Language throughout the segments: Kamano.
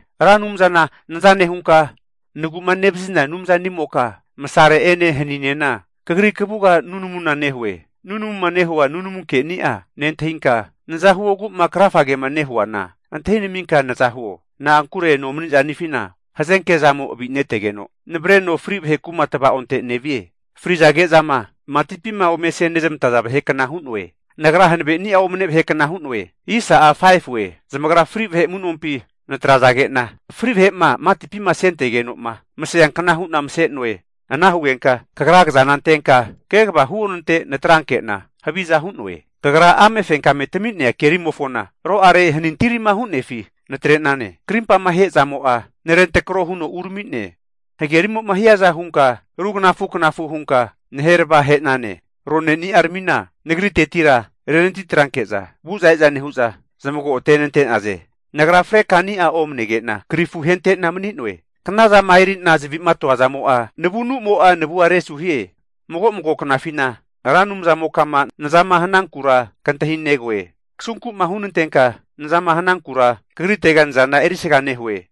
Ra Anumzana naza nehunka nagu'ma nevazina Anumzanimoka, masare'ene haninena Kagri kavuga nunamuna nehue. Nunamuma nehua nunamu keni'a nentahinka, naza huogu'ma krafagema nehuana antahinaminka naza huo. Na'ankure nomanizanifina hazenke zamo'a avineteno, navareno fri vahe kuma tava'onte nevie. Fri'zage'zama matipima ome asenezmantaza vahekna hu'noe. Nagra hanaveni'a omane vahe kna hu'noe. Zamagra fri vahe amu'nompi natrazage'na, fri' vahe'ma matipima asentegeno'ma maseankna hu'na mase'noe. Ana hugenka Kagra kazana antenka kegava huonante natranke'na haviza hu'noe. Kagra amefenkame tami'nea kerimofona aro'are, hanintirima hu'nefi natre'nane. Krimpama ahezamo'a narentrako huno urami'ne. Hagerimo'ma hiaza hunka rugnafu knafu hunka naherava he'nane. Roneni'aramina nagritetira renatitranke'za vu'za e'za nehu'za zamago atenante'naze. Nagra frekani'a omanege'na krifu ahente'na manue. Knazama eri'na zavi'ma atoazamo'a, navunumo'a navua resuhie. Mago mago knafina Ra Anumzamokama nazama hanankura kantahinegoe. Kasunku'ma hunantenka nazama hanankura kagritega nazana erisga nehue.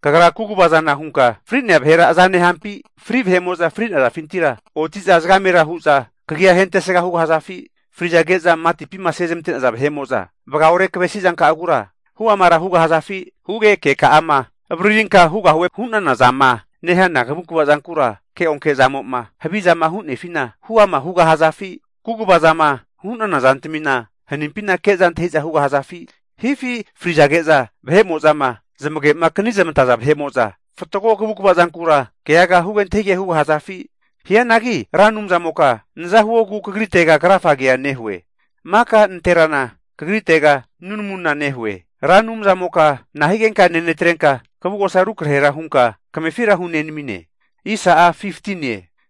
Kagra kagu'vazana hunka fri'nea vahera aza nehampi? Fri'naza vahe'mo'za fri'nazafintira oti'za zagamera hu'za kagia ahentesga hugahazafi? Frizage'zama matipima asezmante'naza vahe'mo'za vagaore kavesizanka'agura huamara hugahazafi? Huge keka'ama avaririnka hugahuema hu'nana zama nehana kavukva zankura keonke zamo'ma havizama hu'nefina huama hugahazafi? Kaguvazama zama hu'nana zantamina hanimpina ke'za antahi'za hugahazafi? Hifi frizage'za vahe'mo'zama zamage'ma akanizmantaza vahe'mo'za fatgo kavukva zankura keaga huge antahigamige hugahazafi? Hianagi Ra Anumzamoka naza huogu kagritega krafagea nehue. Maka nanterana kagritega nunamuna nehue. Ra Anumzamoka nahigenka nenatrenka, kavugosa rukrahera hunka kamefira hunenamine?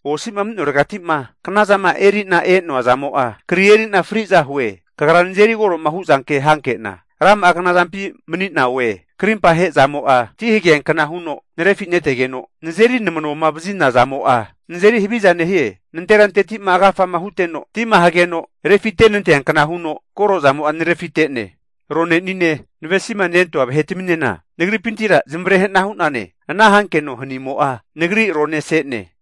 Osi'ma mani'noregati'ma knazama eri'na e'noa zamo'a, kri eri'na fri'za hue. Kagra nazeri koro'ma hu' zanke hanke'na, rama'a knazampi mani'na oe. Krimpa ahe'zamo'a ti hageankna huno narefi netegeno, nazeri namanoma vazina zamo'a nazeri haviza nehie. Nanteranteti'ma agafama huteno tima hageno refite'nanteankna huno korozamo'a narefite'ne. Ronenine navesimanentoa vahetaminena nagripintira zamavare hana hu'nane. Ana hankeno hanimo'a, nagri arone ase'ne.